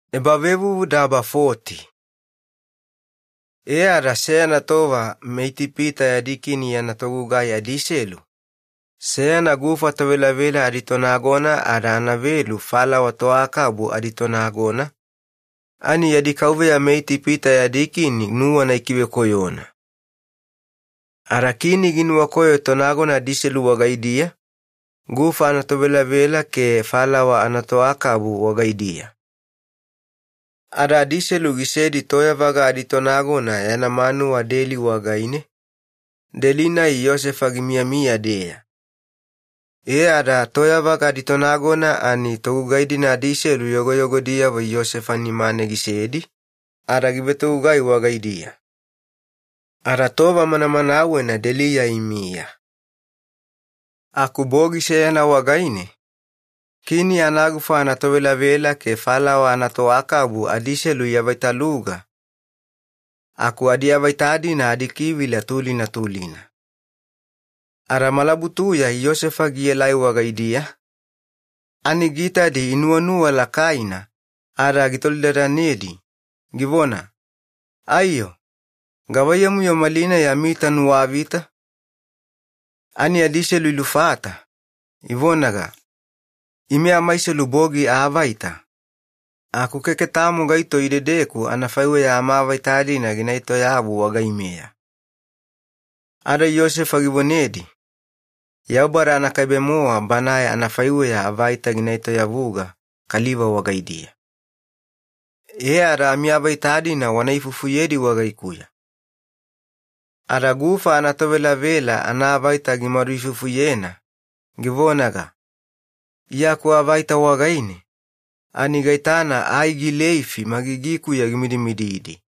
Yosefa avaita gietoyavuga. E, ada seyana tova meItipita adikini yana togugai adiselu, seyana gufa tovelavela aditonagona ada anavelu falawa toakabu aditonagona, ani yadi kauveya meItipita adikini nuwana ikivekoyona. Ada kini ginuwakoyo tonagona adiselu wagaidiya, gufa anatovelavela ke falawa anatoakabu wagaidiya. Ada adiselu gisedi toyavaga aditonagona yana manuwa deli wagaine, deli-nai Yosefa gimiyamiya-deya. E ada toyavaga aditonagona ani togugai-dina yogoyogodiyavo Yosefa nimane gisedi ada givetogugai wagaidiya. Ada deliya imiya tova manamanawena. Bogi seyana wagaine kini anagufa anatovelavela ke falawa anatoakabu adiselu iavaitaluga aku adiavaita-dina adikivila tulina tulina. Ada malabutuya Yosefa gielai wagaidiya ani giitadi inuwanuwa lakaina ada gitolidadanedi, givona, “Aiyo, gavaiyamu-yo malinai amiita nuwavita?” Ani adiselu ilufata, ivonaga, “Ime amaiselu bogi aavaita, aku keke tamo gaito idedeku anafaiweya amaavaita-dina gina etoyavu wagaimeya.” Ada Yosefa givonedi, “Yaubada anakaibe-mowa Banae anafaiweya avaita gina etoyavuga kaliva wagaidiya. E ada amiavaita-dina wana ifufuyedi wagaikuya.” Ada gufa anatovelavela anaavaita gimaduifufuyena, givonaga, “Iya akuavaita wagaine ani gaitana ai gileifi magigikuya gimidimididi,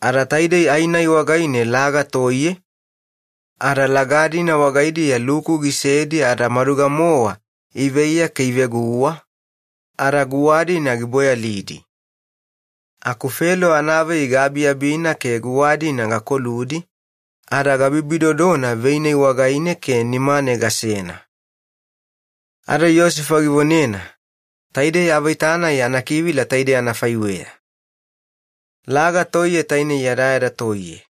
ani taidei ai-nai wagaine laga toiye, ada laga-dina wagaidiya luku gisedi ada maduga-mowa iveiya ke iveguwa ada guwadi-dina giboyalidi. Aku Felo anavei gaabiabina ke guwa-dina gakoludi, ada gabibidodona vei-nai wagaine ke nimane gasena.” Ada Yosefa givonena, “Taidei avaita-nai anakivila taidei anafaiweya: Laga toiye tainei yadayada toiye.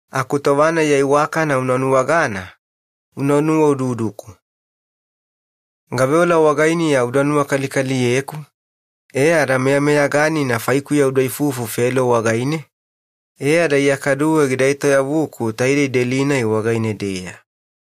Ada tova-nai ya iwakana una nuwagana, una nuwaududuku. Gaveola wagainiya uda nuwakalikaliyeku ke meyameyaganina faikuya udaifufu Felo wagaine ke iya kaduwe gida etoyavuku taidei deli-nai wagaine-deya.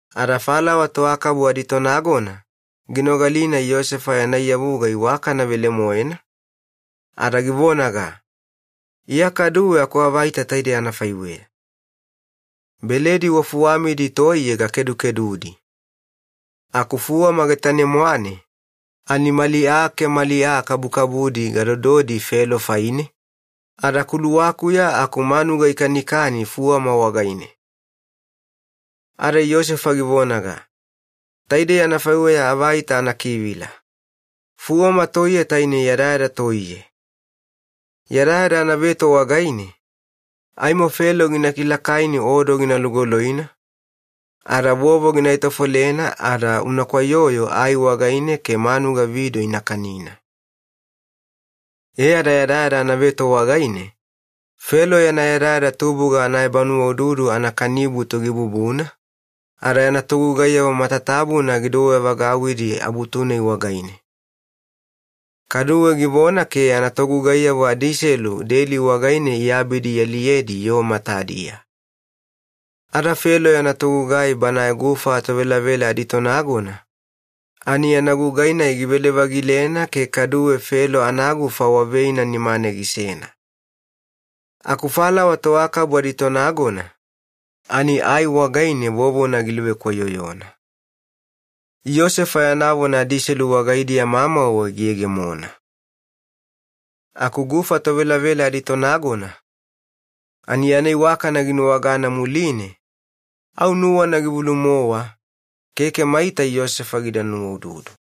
Ada falawa toakabu aditonagona ginogalina Yosefa yana iyavuga iwakana velemoena ada givonaga, “Iya kaduwe akuavaita taidei anafaiweya: Beledi wafuwamidi toiye gakedukedudi. Aku fuwama getane-mwane ani mali aa ke mali aa kabukabudi gadododi Felo faine, ada kuluwakuya aku manuga ikanikani fuwama wagaine.” Ada Yosefa givonaga, “Taidei anafaiweya avaita anakivila: Fuwama toiye tainei yadayada toiye. Yadayada anaveto wagaine aimo Felo gina kilakaini odo gina lugoloina ada vovo gina etofolena ada una kwaiyoyo ai wagaine ke manuga vido ina kanina.” E ada yadayada anaveto wagaine Felo yana yadayada tubuga anaebanuwaududu anakanibutu gibubuna, ada yana togugaiyavo matatabuna gidouwe-vagauwidi abutu-nai wagaine. Kadu givona ke yana togugaiyavo adiiselu deli wagaine iabidi ialiyedi yoo matadiya. Ada Felo yana togugai banae gufa tovelavela aditonagona ani yana gugai-nai givele-vagilena ke kaduwe Felo anagufa waveina nimane gisena. Aku falawa toakabu aditonagona ani ai wagaine vovona giluvekwaiyoyona. Yosefa yana vona adiselu wagaidiya mamauwe giyegemona. Aku gufa tovelavela aditonagona ani yana iwakana ginuwagana muline au nuwana givulu-mowa, keke maita Yosefa gida nuwaududu.